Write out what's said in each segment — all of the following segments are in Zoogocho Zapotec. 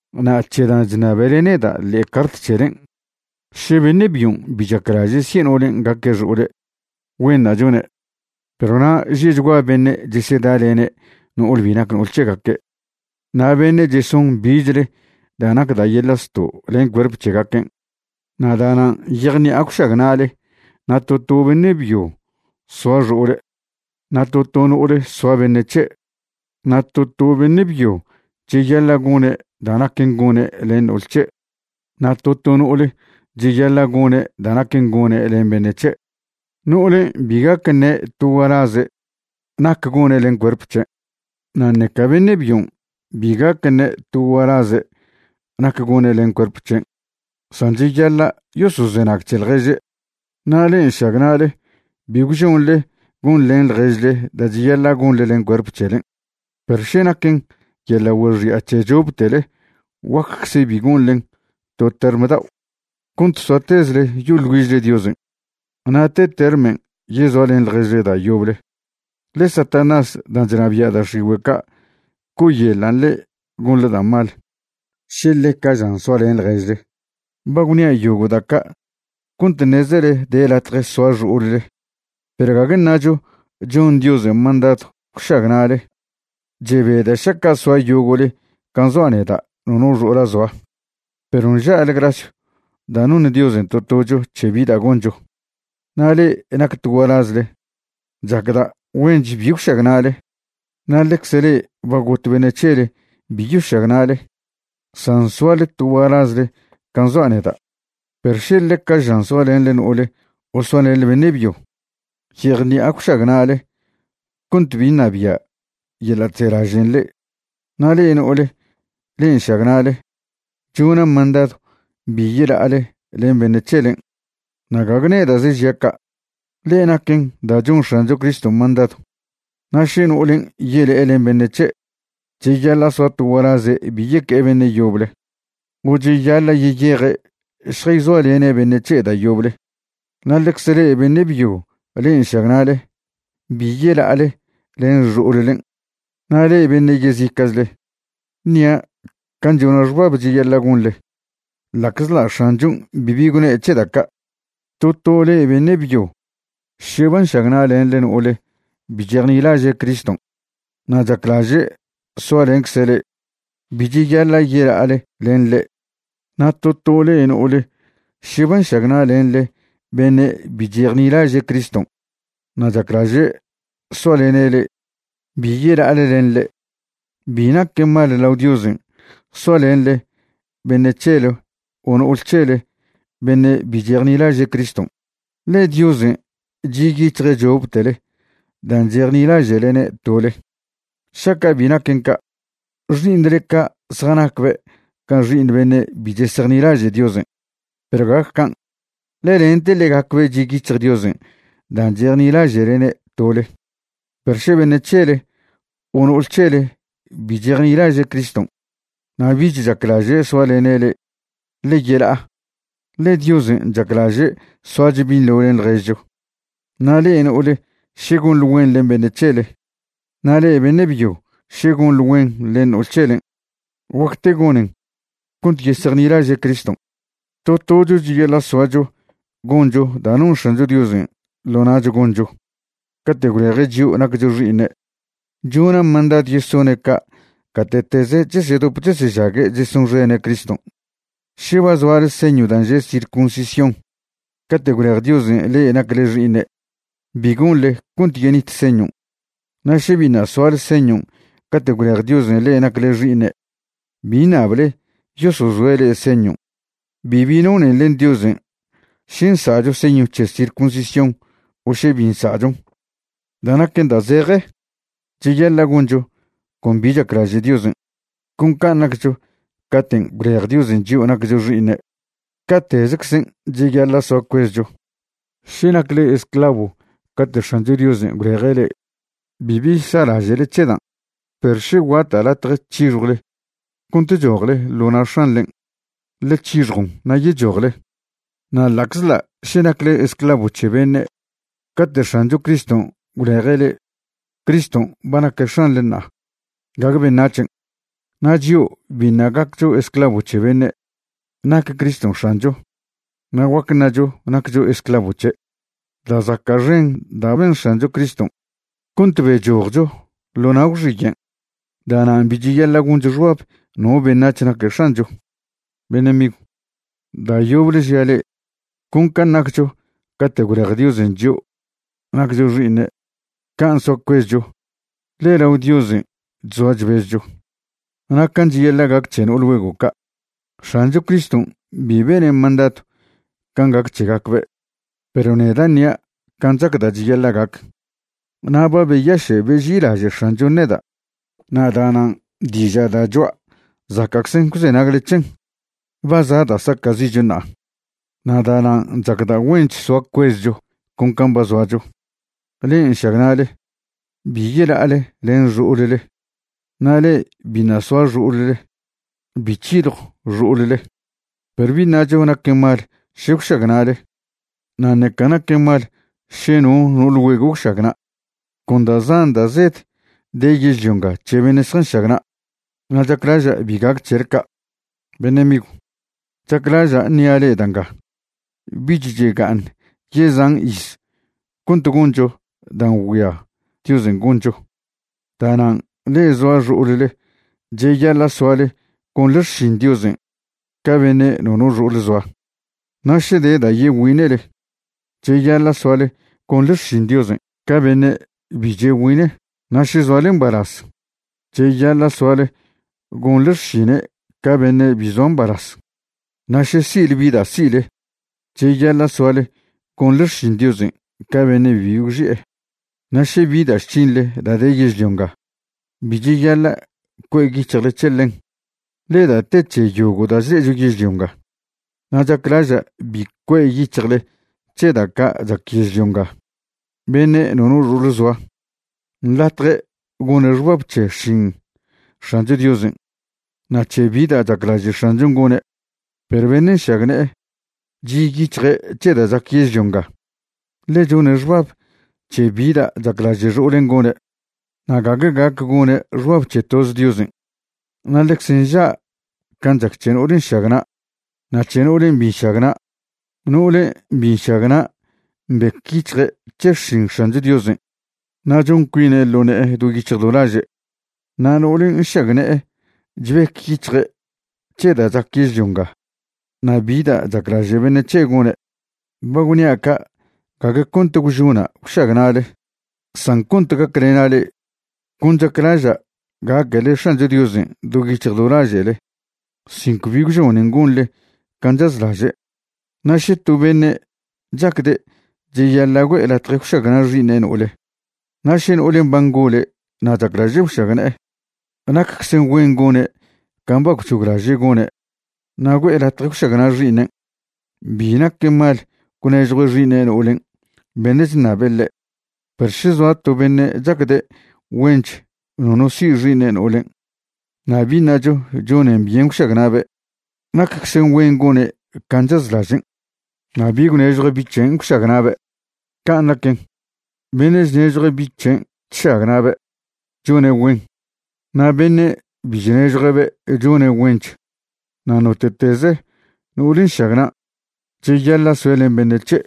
Na' c̱he dan' chṉabele neda' ḻe'e cart c̱helen', še beṉe' byon' bi chaclaže' si'e no'olen' gaque' xo'ole', güenṉa' chone'. Perw na' že'chgua beṉe' chesedalene' no'ole bi nac no'ol c̱hegaque', na' beṉe' cheson bichle da' nac da' yeḻa' zto' len cuerp c̱hegaquen', na' da'nan' yejṉi'a gwšagna'le na' to to beṉe' byo soa xo'ole' na' to to no'ole soa beṉe' c̱he'. Na' to to beṉe' byo cheyaḻa' gone' da' naquen gone' len no'ol c̱he' na' to to no'ole cheyaḻa' gone' da' naquen gone' len beṉe' c̱he'. No'olen' bi gac ṉe' to gualaze' nac gone' len cuerp c̱hen' na' ṉeca beṉe' byon' bi gac ṉe' to gualaze' nac gone' len cuerp c̱hen', san cheyaḻa' yosozenag c̱he ḻježe'. Na' le'e nšagna'le bi gwžonḻe gonḻen ḻježle da' cheyaḻa' gonḻe len cuerp c̱helen', perw še naquen yeḻa' güexi'a c̱he choptele guaccze bi gonḻen to term dao' cont soatezle yoḻ güižle Diosen'. Na' te termen' yezoalen ḻježle da' yoble, ḻe Satanás dan' chnabia' da' x̱igüe' ca' co'oyeḻan' le'e gonḻe da' mal še ḻeca žan soalen ḻježle. Ba gwnia' yogo' da' ca' cont ṉezele de latje soa xo'olle, perw gague ṉacho chon Diosen' mandadw gwšagna'le. Chebeda' šaca' soa yogo'le can' zoa' neda' nono xo'ola' zoa. Perw nža'le grasyw da' noṉ Diosen' to tocho c̱he bi da' goncho. Na' le'e nac to gualazle, chacda' güench bi gwšagna'le, na' ḻecze le'e ba got beṉe' c̱hele bi yošagna'le, san soale to gualazle can' zoa' neda'. Perw še ḻeca žan soalenḻe no'ole o soalenḻe beṉe' byo, yejṉi'a gwšagna'le cont bi ṉabia' yeḻa' chzelažen' le'e. Na' le'e no'ole le'e nšagna'le, chona' mandadw bi yela'ale len beṉe' c̱helen'. Na' gague neda'ze žia' ca', ḻe naquen da' chon X̱ancho Criston' mandadw. Na' še no'olen' yele'e len beṉe' c̱he', cheyaḻa' soa to gualaze' bi yeque'e beṉe' yoble o cheyaḻa' yeyeje' šjayzoalene' beṉe' c̱he' da' yoble. Na' ḻecze le'e beṉe' byo le'e nšagna'le, bi yela'ale len xo'ollen'. Na' le'e beṉe' yezica'chle, ṉia' can' chona' xbab cheyaḻa' gonḻe, ḻa'czḻa' X̱anchon' bibi gwne' c̱he da' ca'. To to le'e beṉe' byo še ba nšagna'lenḻe no'ole bi chejnilaže' Criston' na' chaclaže' soalencze' le', bi cheyaḻa' yela'ale len ḻe'. Na' to to le'e no'ole še ba nšagna'lenḻe beṉe' bi chejnilaže' Criston' na' chaclaže' soalene' le', bi yela'ale len ḻe'. Bi naquen mal lao Diosen' soalenḻe beṉe' c̱hele o no'ol c̱hele beṉe' bi chejnilaže' Criston', ḻe Diosen' chi' yic̱hje' choptele dan' chejnilaže'lene' tole. Šaca' bi naquen ca', xi'iṉle ca' zjanacbe' ca xi'iṉ beṉe' bi chesejnilaže' Diosen', perw gague can', ḻe lente ḻegacbe' chi' yic̱hj Diosen' dan' chejnilaže'lene' tole. Perw še beṉe' c̱hele o no'ole c̱hele bi chejnilaže' Criston' na' bich chaclaže' soalene' le'e, ḻe yela'a, ḻe Diosen' chaclaže' soacho binḻo len ḻježcho. Na' le'e no'ole še gonḻe güen len beṉe' c̱hele na' le'e beṉe' byo še gonḻe güen len no'ol c̱helen', guacte gonen cont yesejnilaže' Criston'. To tocho cheyaḻa' soacho goncho da' non X̱ancho Diosen' ḻo na'cho goncho cate' gwleje' chio' naccho xi'iṉe'. Chona' mandadw yesone' ca' gate'teze chesedop chesežague' chesonxene' Criston'. Še ba zoale señw dan' že' circuncisión cate' gwlej Diosen' le'e nacle xi'iṉe', bi gonḻe cont yenit señon'. Na' še biṉa' soale señon' cate' gwlej Diosen' le'e nacle xi'iṉe', bi ṉable yosozoe' le'e señon'. Bibi nonen len Diosen' še nsa'cho señw c̱he circuncisión o še bi nsa'chon. Da' naquen da' zeje, cheyaḻa' goncho con bi chaclaže' Diosen'. Con can' naccho caten' gwlej Diosen' chio' naccho xi'iṉe', ca'tezeczen' cheyaḻa' soa cuezcho. Še nacle esclavo cate' X̱ancho Diosen' gwleje' le'e, bibi sa'laže'le c̱he dan'. Perw še guata' latje c̱hixjwle cont chojle ḻo na' x̱anḻen', ḻe c̱hixjon na' yechojle. Na' ḻa'czḻa' še nacle esclavo c̱he beṉe' cate' X̱ancho Criston' gwleje' le'e, Criston' ba naque' X̱anḻe ṉa'a, gague beṉac̱hen'. Na' chio' biṉa' gaccho esclavo c̱he beṉe', nac Criston' X̱ancho, na' guac ṉacho naccho esclavo c̱he'. Da' zaca' xen da' ben X̱ancho Criston' cont bechojcho ḻo na' gwxiyen'. Da'nan' bi cheyaḻa' goncho xbab no beṉac̱h naque' x̱ancho. Beṉe' migw, da' yoble žia' le'e, con can' naccho cate' gwlej Diosen' chio' naccho xi'iṉe', can' soa cuezcho, ḻe lao Diosen' chzoa chbezcho. Na' can' cheyaḻa' gac c̱he no'ol güego' ca', X̱ancho Criston' bi bene' mandadw can' gac c̱hegacbe', perw neda' ṉia' can' chacda' cheyaḻa' gac, na' ba beyaše' beži'ilaže' X̱anchon' neda', na' da'nan' diža' da' choa' zaca'czen gwzenagle c̱hen. Ba za' da' saca'zi'cho ṉa'a, na' da'nan' chacda' güench soa cuezcho con can' ba zoacho. Le'e nšagna'le, bi yela'ale len xo'olle, na' le'e biṉa' soa xo'olle, bi c̱hiljw xo'olle. Perw bi ṉacho naquen mal še gwšagna'le, na' ṉeca naquen mal še no no'ol güego' gwšagna'. Con da' zan da' zed de yežlio nga c̱he beṉe' zjanšagna', na' chaclaža' bi gac c̱hele ca'. Beṉe' migw, chaclaža' ṉia' le'e da' nga: Bich chega'aṉ yezan iz cont goncho dan' ngüia Diosen' goncho. Da'nan' le'e zoa xo'olle cheyaḻa' soale gonḻe xšin Diosen' ca beṉe' nono xo'ole' zoa. Na' še de da' yegüine'le, cheyaḻa' soale gonḻe xšin Diosen' ca beṉe' bi chegüine'. Na' še zoale mbalaz, cheyaḻa' soale gonḻe xšine' ca beṉe' bi zoa mbalaz. Na' še si'le bi da' si'le, cheyaḻa' soale gonḻe xšin Diosen' ca beṉe' bibi gwxi'e. Na' še bi da' chc̱hinḻe da' de yežlio nga, bi cheyaḻa' cue' yic̱hjle c̱he ḻen, ḻe da' te c̱he yogo' da' chle'echo yežlio nga. Na' chaclaža' bi cue' yic̱hjle c̱he da' ca' chac yežlio nga. Beṉe' nono xo'ole' zoa nḻatje' gone' xbab c̱he xšin X̱ancho Diosen' na' c̱he bi da' chaclaže' X̱anchon' gone'. Perw beṉe' nšagne'e chi' yic̱hje' c̱he da' chac yežlio nga, ḻe chone' xbab c̱he bi da' chaclaže' xo'olen' gone', na' gague gac gone' xbab c̱he toz Diosen'. Na' ḻecze nža' can' chac c̱he no'ole nšagna' na' c̱he no'olen' bi nšagna'. No'ole bi nšagna' mbec yic̱hje' c̱he xšin X̱ancho Diosen' na' chon cuine' ḻo ne'e do yic̱hj do laže'. Na' no'ole nšagne'e chbec yic̱hje' c̱he da' chac yežlio nga na' bi da' chaclaže' beṉe' c̱he' gone'. Ba gwnia' ca' gague cont gwžona' gwšagna'le san cont gaclena' le'e. Con chaclaža' gaquele X̱ancho Diosen' do yic̱hj do laže'le sin cbi gwžonen gonḻe can' chazlaže'. Na' še to beṉe' chacde' cheyaḻa' güe'e latje gwšagna' xi'iṉe' no'ole, na' še no'olen' ba ngole' na' chaclaže' gwšagne'e, nacczen güen gone' can' ba gwc̱hoglaže' gone' na' güe'e latje gwšagna' xi'iṉen'. Bi naquen mal gwnežjue' xi'iṉe' no'olen' beṉe' chṉabe' ḻe'. Perw še zoa to beṉe' chacde' güench nono si' xi'iṉe' no'olen' na' bi ṉacho chonen byen gwšagna'be', nacczen güen gone' can' chazlažen' na' bi gwnežjue' bi' c̱hen' gwšagna'be'. Can' naquen, beṉe' chnežjue' bi' c̱hen' chšagna'be' chone' güen, na' beṉe' bi chnežjue'be' chone' güench. Na' note'teze no'ole nšagna', cheyaḻa' soe' len beṉe' c̱he'.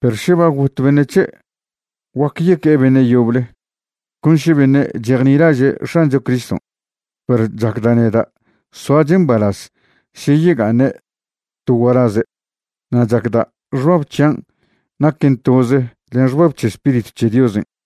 Perw še ba got beṉe' c̱he', guac yeque'e beṉe' yoble, con še beṉe' chejnilaže' X̱ancho Criston'. Perw chacda' neda' soache' mbalaz še yega'aṉe' to gualaze', na' chacda' xbab c̱hian' naquen toze len xbab c̱he Spiritw c̱he Diosen'.